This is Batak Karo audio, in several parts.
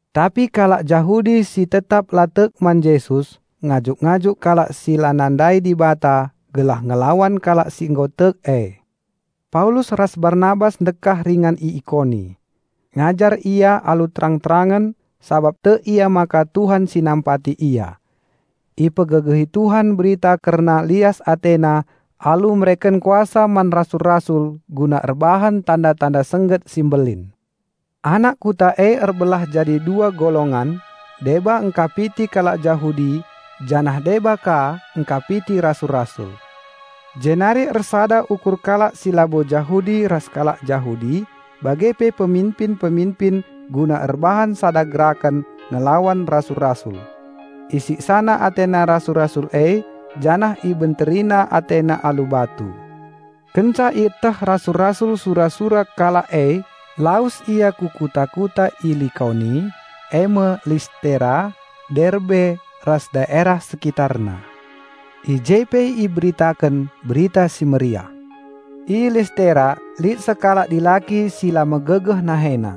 Tapi kalak Jahudi si tetap la tek man Jesus ngajuk-ngajuk kalak si la nandai Dibata gelah ngelawan kalak si nggo tek e. Paulus ras Barnabas ndekah ringan i Ikoni. Ngajar ia alu terang-terangen sabap tek ia maka Tuhan si nampati ia. Ipegegehi Tuhan Berita kerna lias AteNa alu mereken kuasa man rasul-rasul guna erbahan tanda-tanda sengget si mbelin. Anak kuta e erbelah jadi dua golongan, deba engkapiti kalak Jahudi, janah deba ka engkapiti rasul-rasul. Jenari ersada ukur kalak si labo Jahudi ras kalak Jahudi, bage pe peminpin-peminpin guna erbahan sada geraken ngelawan rasul-rasul. Isiksana atena rasul-rasul e janah ibenterina atena alu batu. Kenca ieteh rasul-rasul sura-sura kalak e, lawes ia ku kuta-kuta i Likaoni, eme Listera, Derbe ras daerah sekitarna. I je pe iberitaken Berita Si Mehuli. I Listera lit sekalak dilaki si la megegeh nahena.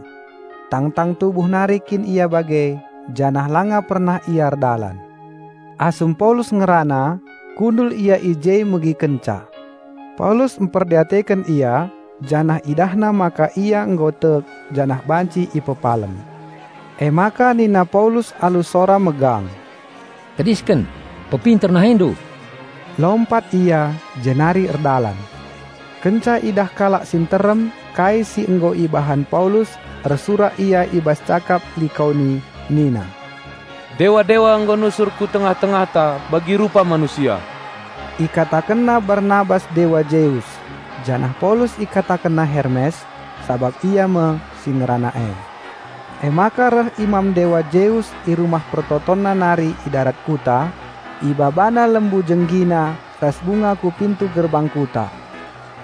Tangtang tubuh nari kin ia bage, janah langa pernah ia erdalan. Asum Paulus ngerana, kundul ia i je megikenca. Paulus mperdiateken ia janah idahna maka ia nggo tek janah banci ipepalem. Emaka nina Paulus alu sora megang, "Tedisken, pepinter nahendu!" Lompat ia jenari erdalan. Kenca idah kalak si nterem kai si nggo ibahan Paulus, ersurak ia i bas cakap Likaoni nina, "Dewa-dewa nggo nusur ku tengah-tengahta bagi rupa manusia!" Ikatakenna Barnabas dewa Zeus janah Paulus ikatakenna Hermes, sabap ia me si ngerana e. Emaka reh imam dewa Zeus i rumah pertotonna nari i darat kuta, ibabana lembu jenggina ras bunga ku pintu gerbang kuta.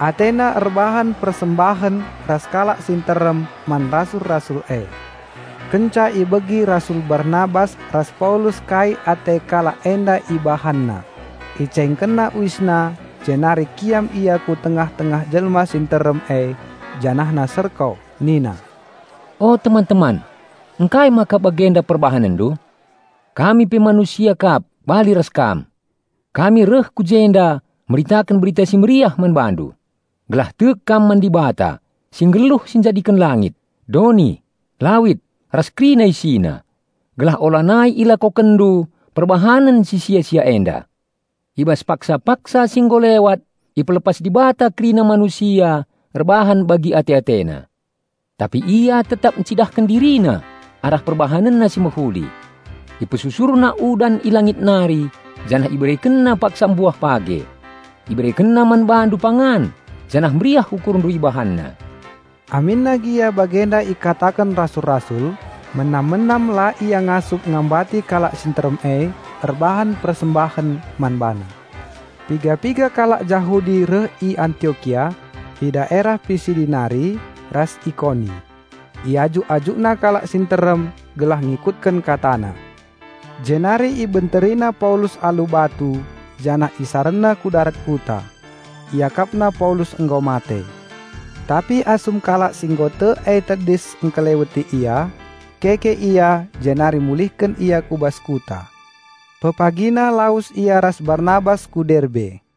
Atena erbahan persembahen ras kalak si nterem man rasul-rasul e. Kenca ibegi rasul Barnabas ras Paulus kai ate kalak enda ibahanna, icaingkenna uisna jenari kiam ia ku tengah-tengah jelma si nterem e janahna serko nina, "O teman-teman, ngkai maka bagenda perbahanenndu? Kami pe manusia kap bali ras kam. Kami reh ku jenda meritaken Berita Si Mehuli man bandu, gelah tek kam man Dibata si nggeluh si njadiken langit, doni, lawit ras kerina isina; gelah ulanai ilakokenndu perbahanen si sia-sia enda. I bas paksa-paksa si nggo lewat ipelepas Dibata kerina manusia erbahan bagi ate-atena. Tapi Ia tetap encidahken DiriNa arah PerbahanenNa si mehuli. IpesusurNa udan i langit nari janah IberekenNa paksa mbuah page. IberekenNa man bandu pangan janah meriah ukurndu IbahanNa." Aminna gia bagenda ikataken rasul-rasul, menam-menam la ia ngasup ngambati kalak si nterem e erbahan persembahen man bana. Piga-piga kalak Jahudi reh i Antiokia, i daerah Pisidi nari, ras Ikoni. Iajuk-ajukna kalak si nterem gelah ngikutken katana. Jenari ibenterina Paulus alu batu janah isarenna ku darat kuta. Iakapna Paulus nggo mate. Tapi asum kalak si nggo tek e tedis engkeleweti ia, keke ia jenari mulihken ia ku bas kuta. Pepagina lawes ia ras Barnabas ku Derbe.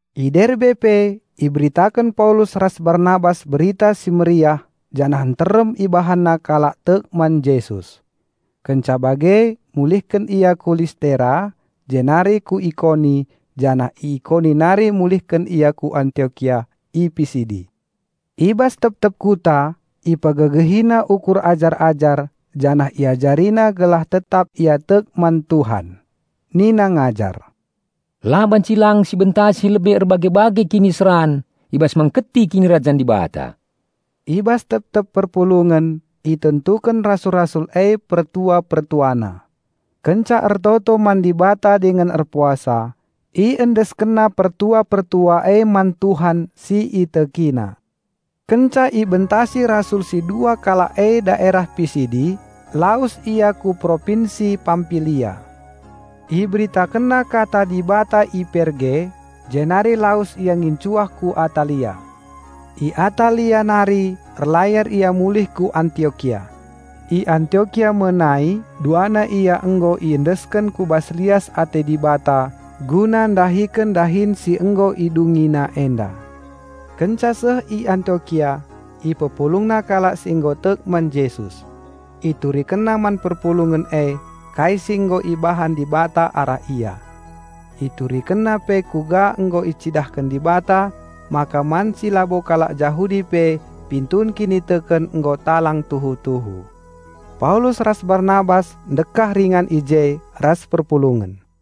I Derbe pe iberitaken Paulus ras Barnabas Berita Si Mehuli janah nterem ibahanna kalak tek man Jesus. Kenca bage mulihken ia ku Listera, jenari ku Ikoni, janah i Ikoni nari mulihken ia ku Antiokia i Pisidi. I bas tep-tep kuta ipegegehina ukur ajar-ajar janah iajarina gelah tetap ia tek man Tuhan. Nina ngajar, "La banci lang sibentasi lebe erbage-bage kiniseran i bas mengketi Kinirajan Dibata." I bas tep-tep perpulungen itentuken rasul-rasul e pertua-pertuana. Kenca ertoto man Dibata dingen erpuasa, iendeskenna pertua-pertua e man Tuhan si itekina. Kenca ibentasi rasul si dua kalak e daerah Pisidi, lawes ia ku Propinsi Pampilia. Iberitakenna Kata Dibata i Perge, jenari lawes ia ngincuah ku Atalia. I Atalia nari erlayar ia mulih ku Antiokia; i Antiokia me nai duana ia nggo iendesken ku bas lias ate Dibata guna ndahiken dahin si nggo idungina enda. Kenca seh i Antiokia ipepulungna kalak si nggo tek man Jesus. Iturikenna man perpulungen e kai si nggo ibahan Dibata arah ia. Iturikenna pe kuga nggo icidahken Dibata maka man si labo kalak Jahudi pe pintun kiniteken nggo talang tuhu-tuhu. Paulus ras Barnabas ndekah ringan i je ras perpulungen.